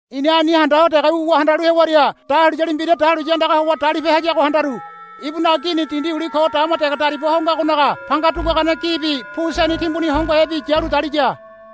I̱na ani handa ho dege wuwa handalu hewaria dahuliyali mbira dahuliya andaga howa dalipe hayago handaru. Ibunaga gini dindi uli ko dama dege dariba ho ngagonaga panga duguagane gibi pu seni timbuni hongohebi yalu daliya.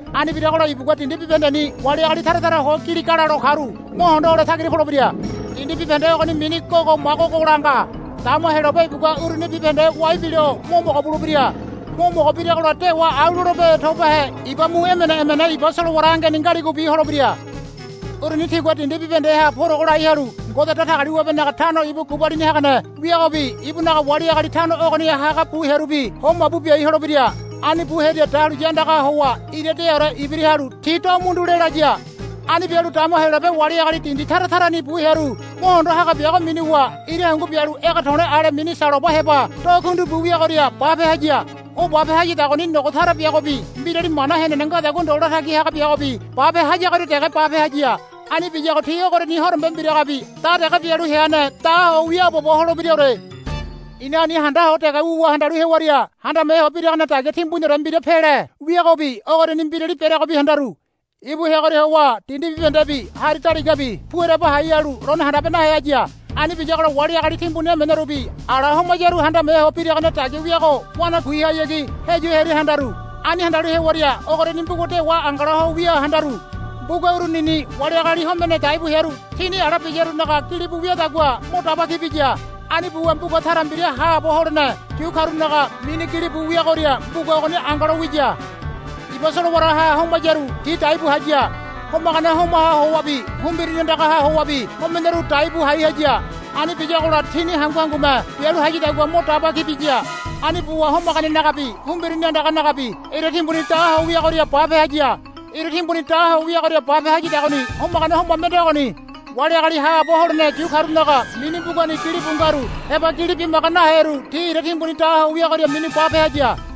Ani biragola ibugua dindi bibahendeni wali agali tara tara ho giligalalo karu mo hondo hole tagira polebira. Dindi bibahende ogoni mini Gogo Magogola nga. Dama Heyolabe ibugua uruni bibahende wai bilo mo mogo bulebira. Mo mogo biragola dewa au lolebe tobahe iba mu emene emene iba solowara angeni ngaligobi holebira. Uruni tigua dindi bibahendeha purogo lai halu Ngode Datagaliwabenaga tano ibu gubalini hagane wiagobi ibunaga wali agali tano ogoniha haga bu hearubi ho mabu biai holebira. Ani bu hearia dahuliya andagaha howa ira deaore ibira halu ti do mundu lelaya. Ani bialu dama Heyolabe wali agali dindi tara tarani bu hearu mohondo haga biago minuwa ira hungu bialu ege to̱le̱ ale mini saloba heba do kundi bu wiagoria bape haya. O bape hayadagoni nogo tara biagobi mbirali mana henene ngadagua ndo latagi haga biagobi bape hayagoria dege bape haya. Ani biyago ti ogoriani horombe mbiragabi da dege bialu heane da ho wiaabobo holebiraore. I̱na ani handa ho dege wuwa handalu hewaria handame ho biragane dagia timbuniore mbira pele wiagobi ogoriani mbirali bereagobi handaru. Ibu heagoria howa dindi bibahendebi hari daligabi pu ereba hai halu lone handabe nahe haya. Ani biyagola wali agali timbuni emenerubi ala homayaru handame ho biragane dagia wiago wanakuihayagi heyu hearia handaru. Ani handalu hewaria ogoriani mbuga dewa angala ho wia handaru. Mbuga urunini wali agali homene daibu hearu tini ala biyarunaga gilibu wiadagua mo daba ki biya. Ani buwa mbuga tara mbira haabo holene yu karunaga mini gilibu wiagoria mbuga ogoni angalo wiya. Iba solowaraha homayaru ti dai bu haya. Homagane homaha howabi humbirini andagaha howabi homeneru dai bu hai haya. Ani biyagola tini hangu hangume bialu hayadagua mo daba ki biya. Ani buwa homaganenagabi humbirini andanagabi ira timbuni da ho wiagoria bape haya. Ira timbuni do ho wiagoria bape hayadagoni homagane homa mende ogoni. Wali agali haabo holene yu karunaga mini mbugani gilibu ngaru heba gili bimaga naheru ti ira timbuni da ho wiagoria minu bape haya.